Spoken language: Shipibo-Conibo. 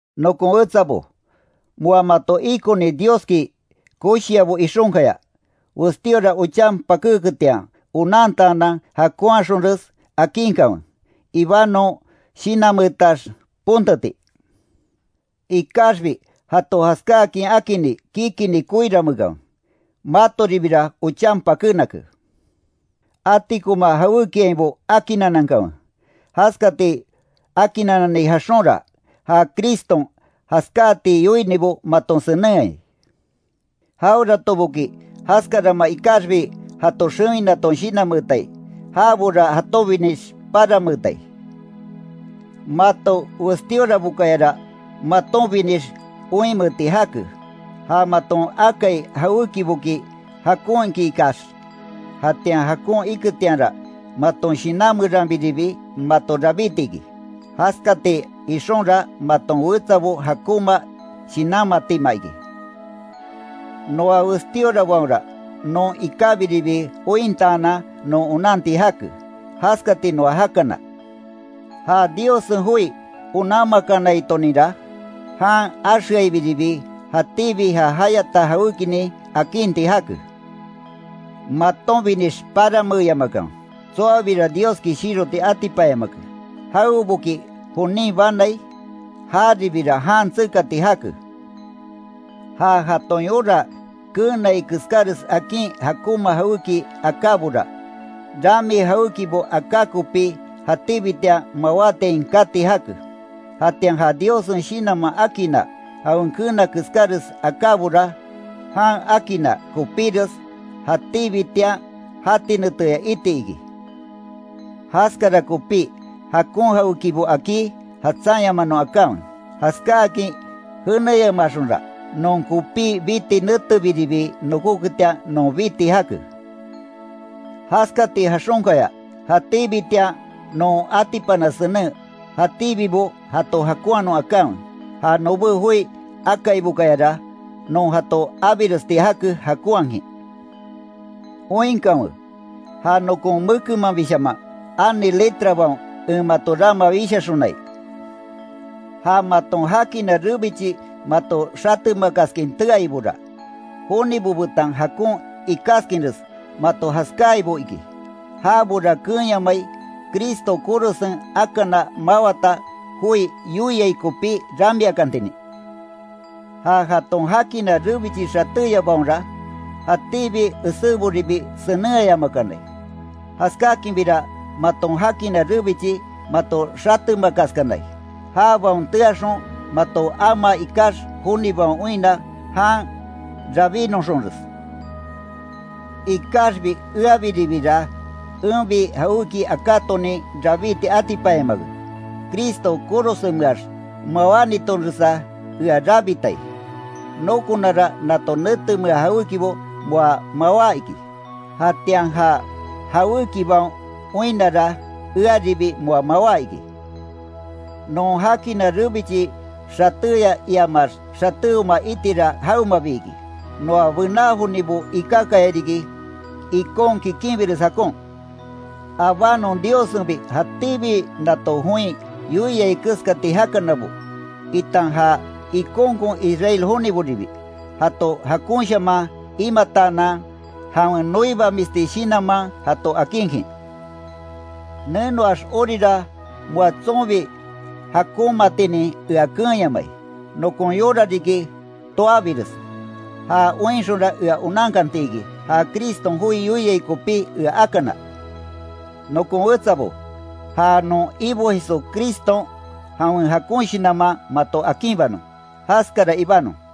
Nokon wetsabo, moa mato ikoni Dioski koshiabo ixonkaya, westíora ochan pakéketian onantaanan jakonhaxonres akinkanwe, ibanon shinanmeetax ponteti. Ikaxbi jato jaskáakin akini kikinni koiranmeekanwe, matoribira ochan pakénake. Atikoma jawékiainbo akinanankanwe. Jaskati akinnanani jaxonra, ja Criston jaskáati yoinibo maton senenhai. Jaweratoboki jaskarama ikaxbi jato xewinaton shinanmeetai, jabora jatonbinix paranmeetai. Mato Westíorabokayara matonbinix oinmeeti jake, ja maton akai jawékiboki jakon iki ikax, jatian jakon iketianra maton shinan meranbiribi mato rabíti iki. Jaskati ixonra maton wetsabo jakonma shinanmatima iki. Noa westíorabaonra non ikábiribi ointaanan non onanti jake, jaskati noa jakana. Ja Diossen joi onanmakanaitoninra, jan axeaibiribi jatíbi ja jayata jawékinin akinti jake. Matonbinix paranmeeyamakanwe. Tsoabira Dioski shiroti atipanyamake. Jaweboki jonin banai, jaribira jan tsekati jake. Ja jaton yora keenai keskáres akin jakonma jawéki akábora, rami jawékibo aká kopi jatíbitian mawátian kati jake. Jatian ja Diossen Shinanman akinna jawen keena keskáres akábora, jan akinna kopíres jatíbitian jati neteya iti iki. Jaskara kopí jakon jawékibo akí, jatsanyamanon akanwe. Jaskáakin jéneyamaxonra, non kopí biti netebiribi nokoketian non biti jake. Jaskati jaxonkaya jatíbitian non atipana senen, jatíbibo jato jakonhanon akanwe. Ja nobé joi akaibokayara, non jato abiresti jake jakonhakin. Oinkanwe, ja nokon mekenmanbishaman ani letrabaon en mato rama wishaxonai. Ja maton jakina rebichi mato xatemakaskin teaibora, jonibo betan jakon ikáskinres mato jaskáaibo iki. Jabora keenyamai, Cristo korosen akana mawata joi yoiai kopí ramiakantinin. Ja jaton jakina rebichi xatéyabaonra, jatíbi eséboribi senenhayamakanai. Jaskáakinbira maton jakina rebichi mato xatemakaskanai, jabaon teaxon mato amaa ikax jonibaon oinna jan rabínoxonres. Ikaxbi eabiribira enbi jawéki akátonin rabíti atipanyamake. Cristo korosenmeax mawánitonresa ea rabitai. Nokonara nato netemea jawékibo moa mawá iki, jatian ja jawékibaon oinnara, earibi moa mawá iki. Non jakina rebichi xatéya iamax xatéoma itira jawemabi iki; noa bená jonibo ikákayariki ikon kikinbires jakon. Abánon Diossenbi jatíbi nato join yoiai keskati jakanabo, itan ja ikonkon Israel joniboribi, jato jakonshaman imataanan jawen noibamisti shinanman jato akinkin. Nenoax orira moa tsonbi jakonmaatinin ea keenyamai. Nokon yora riki, tóabires, ja oinxonra ea onankantiki ja Criston joi yoiai kopí ea akana. Nokon wetsabo, ja non Ibo Jesucriston jawen jakon shinanman mato akinbanon. Jaskara ibanon.